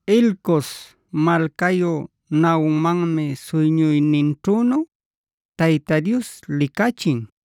Elcos malcayu Nahummanmi suyñuyninćhünu Tayta Dios licachin,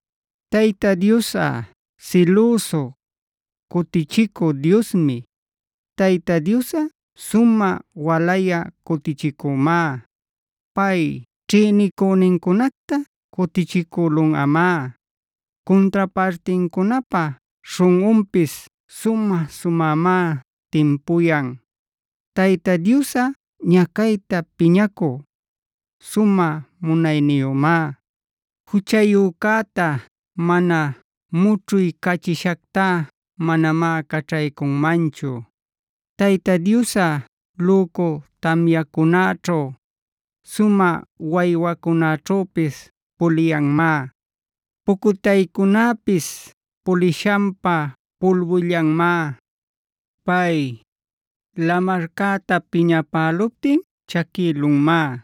Tayta Diosꞌa silüsu, cutichicü Diosmi.b Tayta Diosꞌa sumä walayä cutichicümá. Pay ćhïnicünincunacta cutichicülunꞌamá; cuntra partincunapä śhunꞌunpis sumä-sumämá timpuyan. Tayta Diosꞌa ñacayta piñacü, sumä munayniyümá; juchayücäta mana mućhuycachishacta manamá caćhaycunmanchu.c Tayta Diosꞌa lücu tamyacunaćhu, sumä waywacunäćhüpis puliyanmá. Pucutaycunäpisd pulishanpä pulbullanmá. Pay, lamarcäta piñapäluptin chaquïlunmá,e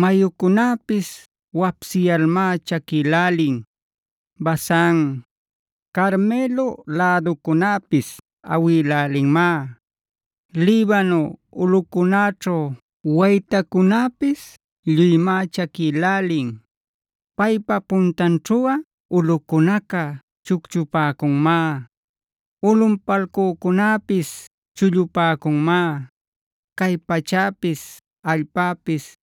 mayucunäpis wapsiyalmá chaquïlälin. Basan, Carmelo läducunäpis awïlälinmá; Libano ulꞌucunäćhu waytacunäpis lluymá chaquïlälin. Paypa puntanćhuꞌa ulꞌucunaca chucchupäcunmá; ulꞌunpalcücunäpis chullupäcunmá; cay pachäpis, allpäpis,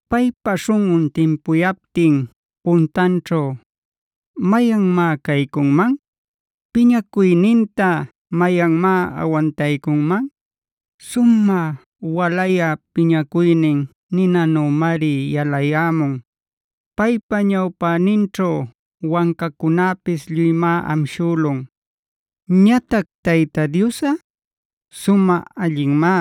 Paypa śhunꞌun timpuyaptin puntanćhu ¿mayanmá caycunman? ¿Piñacuyninta mayanmá awantaycunman? Sumä walayä piñacuynin ninanümari yalayämun; paypa ñawpäninćhu wancacunäpis lluymá amshülun. Ñatac Tayta Diosꞌa, sumä allinmá;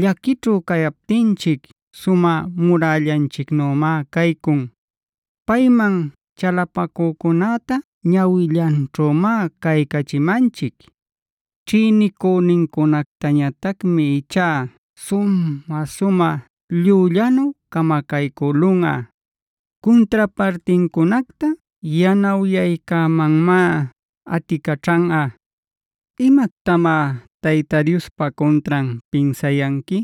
llaquićhu cayaptinchic sumä murällanchicnümá caycun. Payman chalapacücunäta ñawillanćhümá caycachimanchic. Ćhïnicünincunactañatacmi ichá sumä-sumä llüllanu camacaycülunꞌa. Cuntrapartincunacta yanawyaycämanmá aticaćhanꞌa. ¿Imactamá Tayta Diospa cuntran pinsayanqui?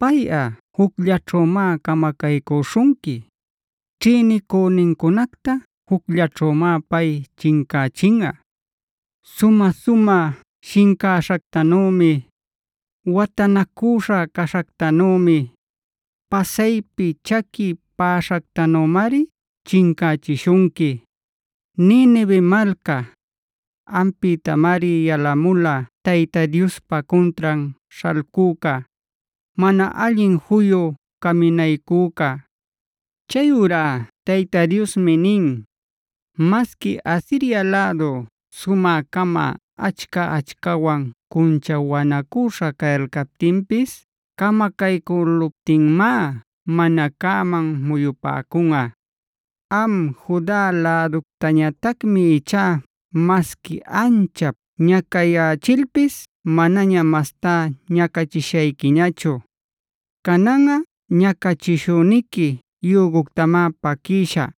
Payꞌa jucllaćhümá camacaycüśhunqui. Ćhïnicünincunacta jucllaćhümá pay chincächinꞌa. Sumä-sumä shincäśhactanümi, watanacüśha caśhactanümi, pasaypi chaqui päśhactanümari chincächishunqui. Ninive malca, ampïtamari yalamula Tayta Diospa cuntran śhalcüca, mana allin juyu caminaycüca. Chayurá Tayta Diosmi nin: “Masqui Asiria lädu sumä-cama, achca-achcawan cunchawänacüśha cayalcaptinpis camacaycüluptinmá mana cäman muyupäcunꞌa. Am Juda läductañatacmi ichá masqui anchap ñacayächilpis manaña mastá ñacachishayquiñachu. Cananꞌa ñacachishüniqui yüguctamá paquïshä;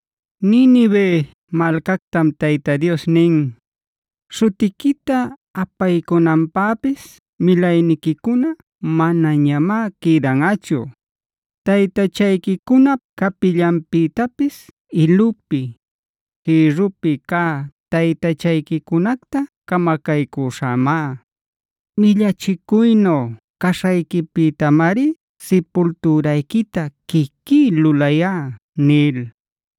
Ninive malcactam Tayta Dios nin: “Śhutiquita apaycunanpäpis milayniquicuna manañamá quïdanꞌachu. Taytachayquicunap capillanpïtapis ilupi, jïrrupi cä taytachayquicunacta camacaycüśhämá. Millachicuynu caśhayquipïtamari sipultürayquita quiquí lulayá” nil.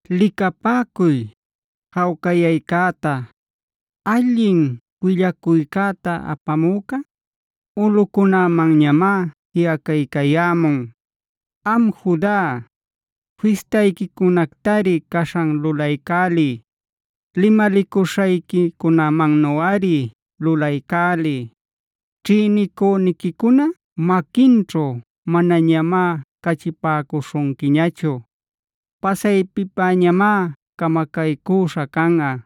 Licapäcuy, jawcayaycäta, allin willacuycäta apamücah ulꞌucunämanñamá jiꞌacaycayämun. Am Juda, fistayquicunactari caśhan lulaycäliy, limalicuśhayquicunamannuꞌari lulaycäliy. Ćhïnicüniquicuna maquinćhu manañamá cachipäcuśhunquiñachu; pasaypipäñamá camacaycüśha canꞌa.